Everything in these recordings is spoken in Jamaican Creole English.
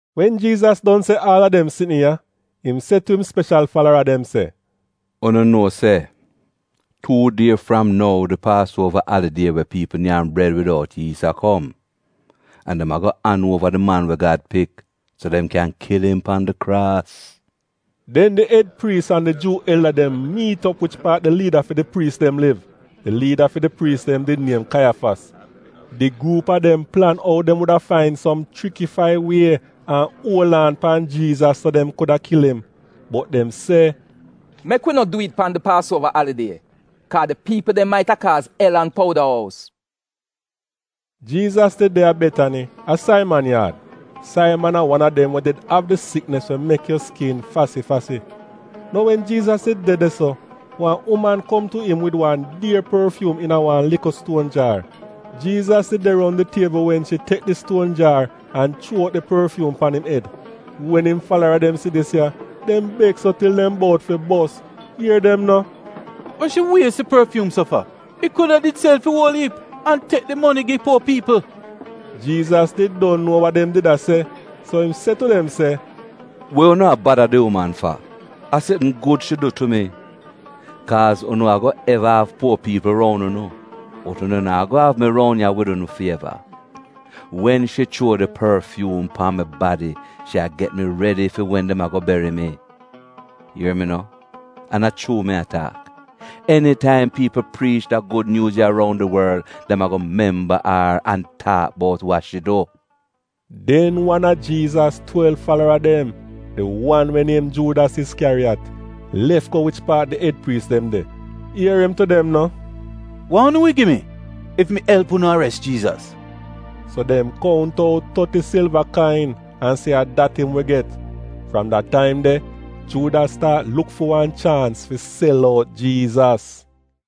Wen Jiizas don se aal a dem sitn ya, im se tu im speshal falara dem se, “Unu nuo se tuu die fram nou di Paasuova alidie we piipl nyam bred widout yiis a kom, an dem ago an uova di Man we Gad Pik so dem kyan kil im pan di kraas.” Den di ed priis an di Juu elda dem miit op wich paat di liida fi di priis dem liv — di liida fi di priis dem did niem Kaiyafas. Di gruup a dem plan ou dem wuda fain som chrikifai wie an uol aan pan Jiizas so dem kuda kil im. Bot dem se, “Mek wi no dwi'it pan di Paasuova alidie, kaa di piipl dem maita kaaz el-an-pouda-ous!” Jiizas did de a Betani, a Saiman yaad. Saiman a wan a dem we did av di siknis we mek yu skin fasi-fasi. Nou wen Jiizas did de de-so, wan uman kom tu im wid wan dier porfyuum iina wan likl stuon jaar. Jiizas did de roun di tiebl wen shi tek di stuon jaar an chuo out di porfyuum pan im ed. Wen im falara dem si dis ya, dem beks so til dem bout fi bos, ier dem no, “We shi wies di porfyuum so fa? It kuda did sel fi uol iip, an tek di moni gi puo piipl!” Jiizas did don nuo wa dem did a se, so im se tu dem se, “We unu a bada di uman fa? A sitn gud shi du tu mi. Kaaz unu ago eva av puo piipl roun unu, bot unu naa go av mi roun ya wid unu fi eva. Wen shi chuo di porfyuum pan mi badi, shi a get mi redi fi wen dem ago beri mi. Ier mi no, an a chuu mi a taak, enitaim piipl priich da Gud Nyuuz ya roun di worl, dem ago memba ar an taak bout wa shi du. Den wan a Jiizas twelv falara dem, di wan we niem Juudas Iskyariyat, lef go wich paat di ed priis dem de. Ier im tu dem no, “Wa unu wi gi mi, ef mi elp unu ares Jiizas?” So dem kount out toti silva kain an se a dat im wi get. Fram da taim de Juudas staat luk fi wan chaans fi sel out Jiizas.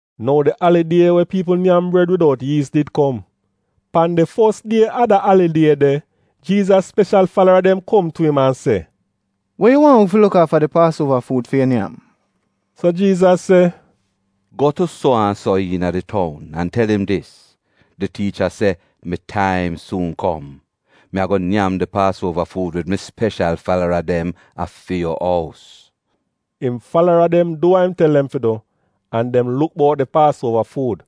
Nou di alidie wen piipl nyam bred widout yiis did kom. Pan di fos die a da alidie de, Jiizas speshal falara dem kom tu im an se, “We yu waahn wi fi luk aafa di Paasuova fuud fi yu nyam?” So Jiizas se, “Go tu suo-an-so iina di toun an tel im dis, ‘Di Tiicha se, “Mi taim suun kom. Mi ago nyam di Paasuova fuud wid mi speshal falara dem a fi yu ous.” Im falara dem du wa im tel dem fi du, an dem luk bout di Paasuova fuud.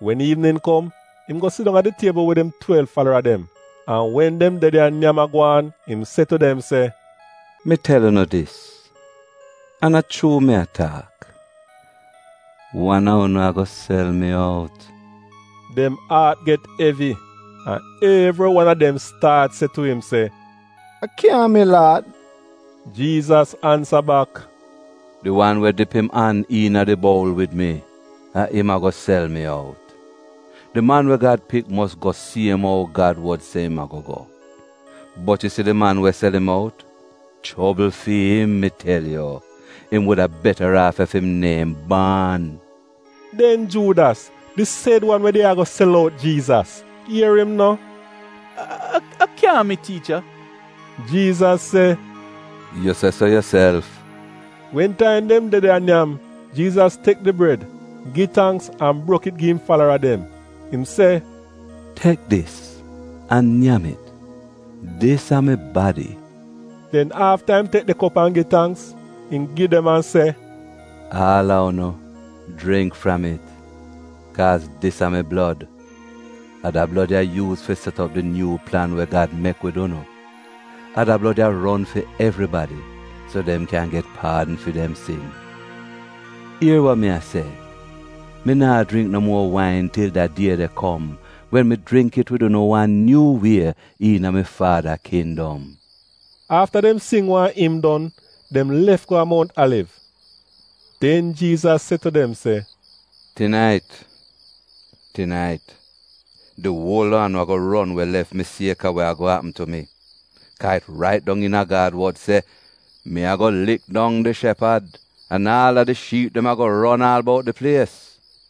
Wen iivnin kom, im go sidong a di tiebl wid im twelv falara dem. An wen dem de de a nyam a gwaan, im se tu dem se, “Mi tel unu dis, an a chuu mi a taak, wan a unu ago sel mi out.” Dem aat get evi, an evri wan a dem staat se tu im se, “A kyaahn mi, Laad?” Jiizas ansa bak, “Di wan we dip im an iina di boul wid mi, a im ago sel mi out. Di Man we Gad Pik mos go siem ou Gad wod se im ago go, bot yu si di man we sel im out — chobl fi'im mi tel yu! Im wuda betaraaf ef im neehn baan.” Den Juudas, di sed wan we did ago sel out Jiizas, ier im no, “A kyaahn mi, Tiicha?” Jiizas se, “Yu se so yuself.” Wen taim dem de de a nyam, Jiizas tek di bred, gi tangks an brok it gi im falara dem. Im se, “Tek dis an nyam it. Dis a mi badi.” Den afta im tek di kop an gi tangks, im gi dem an se, “Aal a unu, jringk fram it. Kaaz dis a mi blod. A da blod ya yuuz fi set op di nyuu plan we Gad mek wid unu. A da blod ya ron fi evribadi, so dem kyan get paadn fi dem sin. Ier wa mi a se, mi naa jringk no muo wain til da die de kom wen mi jringk it wid unu wan nyuu wie iina mi Faada Kindom.” Afta dem sing wan im don, dem lef go a Mount Aliv. Den Jiizas se tu dem se, “Tinait, tinait, di uol a unu ago ron we lef mi sieka wa ago apm tu mi, kaa it rait dong iina Gad wod se: “‘Mi ago lik dong di shepad, an aal a di shiip dem ago ron aal bout di plies.’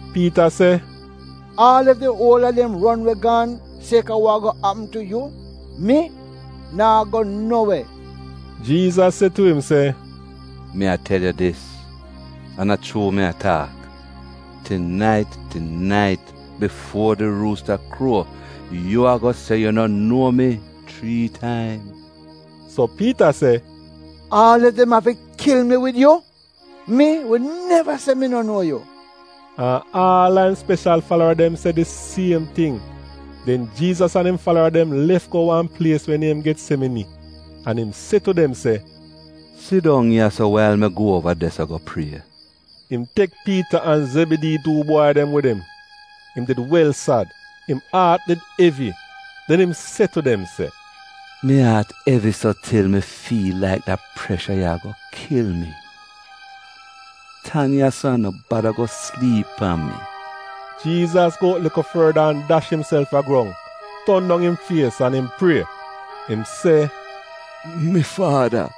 Piita se, “Aal ef di uol a dem ron we gaan sieka wa ago apm tu yu, mi naa go no we!” Jiizas se tu im se, “Mi a tel yu dis an a chuu mi a taak, tinait tinait, bifuo di ruusta kruo, yu ago se yu no nuo mi, chrii taim.” So Piita se, “Aal ef dem afi kil mi wid yu, mi wi neva se mi no nuo yu.” An aal a im speshal falara dem se di siem ting. Den Jiizas an im falara dem lef go wan plies we niem Getsemini, an im se tu dem se, “Sidong ya-so wail mi go uova de-so go prie.” Im tek Piita an Zebidii tu bwai dem wid im. Im did wel sad. Im aat did evi. Den im se tu dem se, “Mi aat evi so til mi fiil laik da presha ya ago kil mi. Tan ya-so an no bada go sliip pan mi.” Jiizas go out likl forda an dash imself a grong, ton dong im fies an im prie. Im se, “Mi Faada,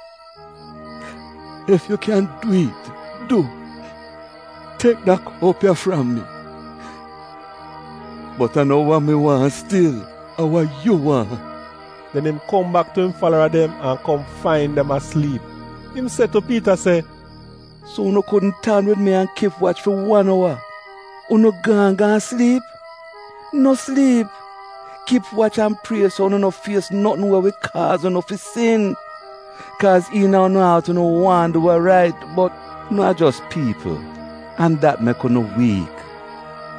ef yu kyan dwi'it, du, tek da kop ya fram mi! Bot a no wa mi waahn stil, a wa yu waahn.” Den im kom bak tu im falara dem an kom fain dem a sliip. Im se tu Piita se, “So unu kudn tan wid mi an kip wach fi wan owa — unu gaan gaan sliip? No sliip. Kip wach an prie so unu no fies notn we wi kaaz unu fi sin. Kaaz iina unu aat unu waahn du wa rait, bot unu a jos piipl an dat mek unu wiik.”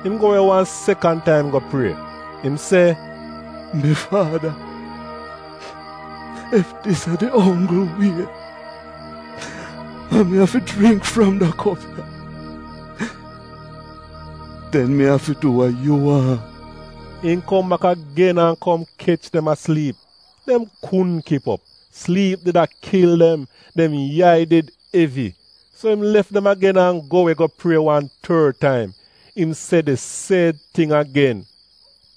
Im go we wan sekan taim go prie. Im se, “Mi Faada, ef dis a di onggl wie, an mi afi jringk fram da kop ya, den mi afi du wa yu waahn.” Im kom bak agen an kom kech dem a sliip. Dem kudn kip op. Sliip did a kil dem; dem yai did evi. So im lef dem agen an go we go prie wan tord taim. Im se di sed ting agen.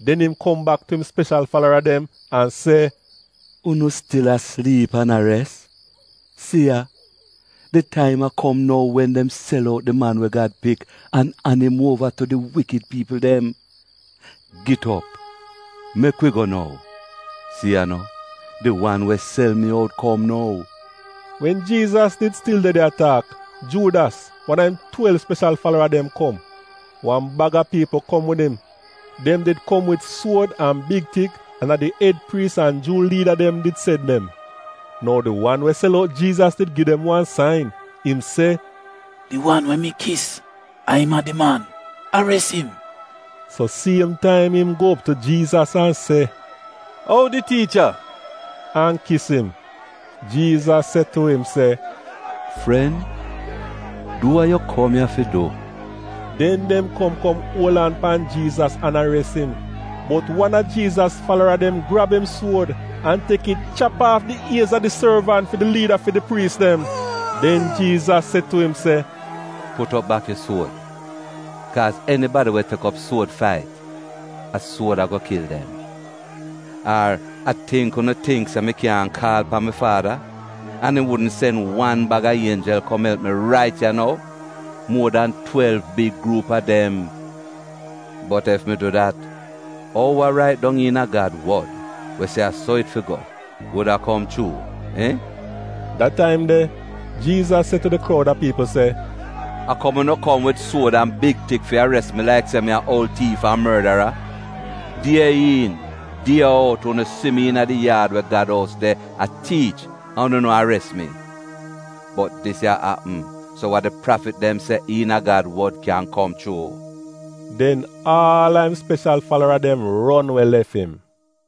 Den im kom bak tu im speshal falara dem an se, “Unu stil a sliip an a res? Si ya, di taim a kom nou wen dem sel out di Man we Gad Pik an an im uova tu di wikid piipl dem. Git op! Mek wi go nou! Si ya no! Di wan we sel mi out kom nou!” Wen Jiizas did stil de de a taak, Juudas, wan a im twelv speshal falara dem, kom. Wan bag a piipl kom wid im. Dem did kom wid suod an big tik, an a di ed priis an Juu liida dem did sen dem. (Nou di wan we sel out Jiizas did gi dem wan sain. Im se, “Di wan we mi kis, a im a di man. Ares im!”) So siem taim im go op tu Jiizas an se, “Oudi Tiicha,” an kis im. Jiizas se tu im se, “Fren, du wa yu kom ya fi du.” Den dem kom kom uol aan pan Jiizas an ares im. Bot wan a Jiizas falara dem grab im suod an tek it chap aaf di iez a di sorvant fi di liida fi di priis dem. Den Jiizas se tu im se, “Put op bak yu suod! Kaaz enibadi we tek op suod fait, a suod ago kil dem. Ar a tingk unu tingk se mi kyaahn kaal pan mi Faada? An im wudn sen wan baga ienjel kom elp mi rait ya nou — muo dan twelv big gruup a dem. Bot ef mi du dat, ou wa rait dong iina Gad wod, we se a so it fi go, wuda kom chuu, iihn?” Da taim de, Jiizas se tu di kroud a piipl se, “A kom unu kom wid suod an big tik fi ares mi laik se mi a oul tiif an mordara?” Die iin die out unu si mi iina di yaad we Gad ous de a tiich, an unu no ares mi. Bot dis ya apm so wa di prafit dem se iina Gad wod kyan kom chuu.” Den aal a im speshal falara dem ron we lef im.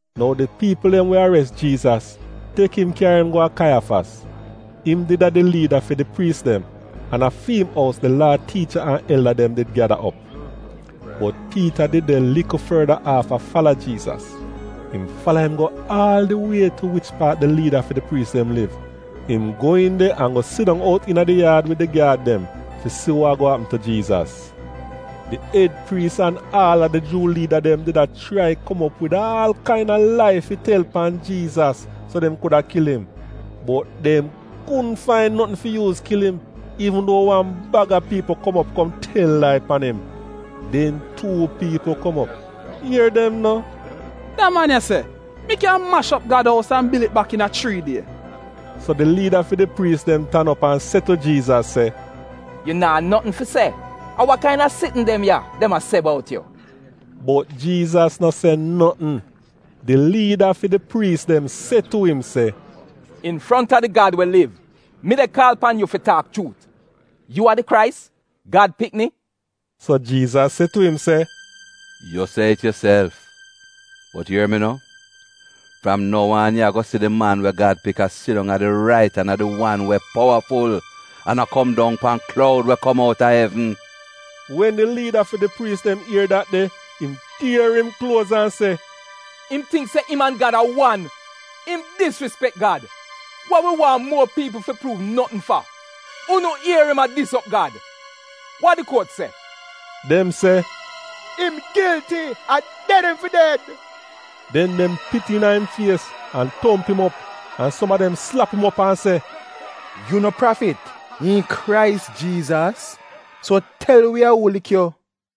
Nou di piipl dem we ares Jiizas, tek im kyari im go a Kaiyafas. Im did a di liida fi di priis dem, an a fi im ous di Laa tiicha an elda dem did gyada op. Bot Piita did de likl forda aaf a fala Jiizas. Im fala im go aal di wie tu wich paat di liida fi di priis dem liv. Im go iin de an go sidong out iina di yaad wid di gyaad dem fi si wa ago apm tu Jiizas. Di ed priis an aal a di Juu liida dem did a chrai kom op wid aal kaina lai fi tel pan Jiizas so dem kuda kil im. Bot dem kudn fain notn fi yuuz kil im, iivn duo wan baga piipl kom op kom tel lai pan im. Den tuu piipl kom op. Ier dem no, “Da man ya se, ‘Mi kyan mash op Gad ous an bil it bak iina chrii die.’” So di liida fi di priis dem tan op an se tu Jiizas se, “Yu naa notn fi se? A wa kaina sitn dem ya, dem a se bout yu?” Bot Jiizas no se notn. Di liida fi di priis dem se tu im se, “Infronta di Gad we liv, mi de kaal pan yu fi taak chuut, yu a di Krais, Gad Pikni?” So Jiizas se tu im se, “Yu se it yuself. Bot ier mi no, fram nou aan yu ago si di Man we Gad Pik a sidong a di rait an a di wan we powaful, an a kom dong pan kloud we kom outa evn.” Wen di liida fi di priis dem ier dat de, im tier im kluoz an se, “Im tingk se im an Gad a wan! Im disrispek Gad! Wa wi waahn muo piipl fi pruuv notn fa? Unu ier im a dis op Gad! Wa di kuot se?” Dem se, “Im gilti. A ded im fi ded.” Den dem pit iina im fies an tomp im op. An som a dem slap im op an se, “Yu no prafit? Iihn Krais Jiizas? So tel wi a uu lik yu!”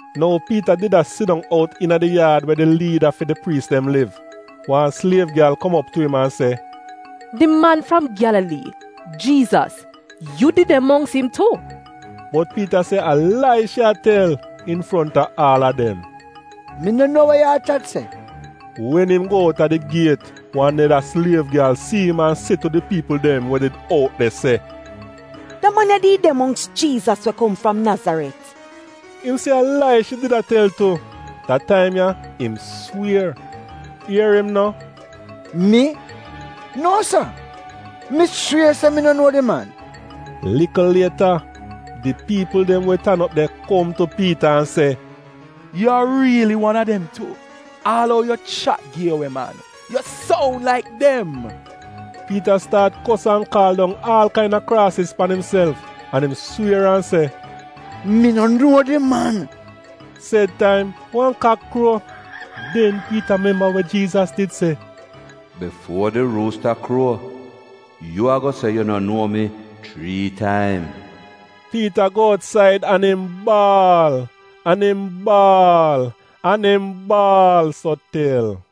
Nou Piita did a sidong out iina di yaad we di liida fi di priis dem liv. Wan sliev gyal kom op tu im an se, “Di man fram Gyalalii, Jiizas, yu did de mongks im tu.” Bot Piita se a lai shi a tel infronta aal a dem: “Mi no nuo we ya'a chat se!” Wen im go out a di giet wan neda sliev gyal si im an se tu di piipl dem we did out de se, “Da man ya did de mongks Jiizas we kom fram Nazaret.” Im se a lai shi did a tel tu. Da taim ya im swier. Ier im no, “Mi? Nuo sa! Mi swier se mi no nuo di man!” Likl lieta, di piipl dem we tan op de kom tu Piita an se, “Yu a riili wan a dem tu — aal ou yu chat gi yu we man, yu soun laik dem!” Piita staat kos an kaal dong aal kaina kraasiz pan imself. An im swier an se, “Mi no nuo di man!” Sed taim wan kak kruo. Den Piita memba we Jiizas did se: “Bifuo di ruusta kruo, yu ago se yu no nuo mi, chrii taim.” Piita go outsaid an im baal, an im baal, an im baal so til.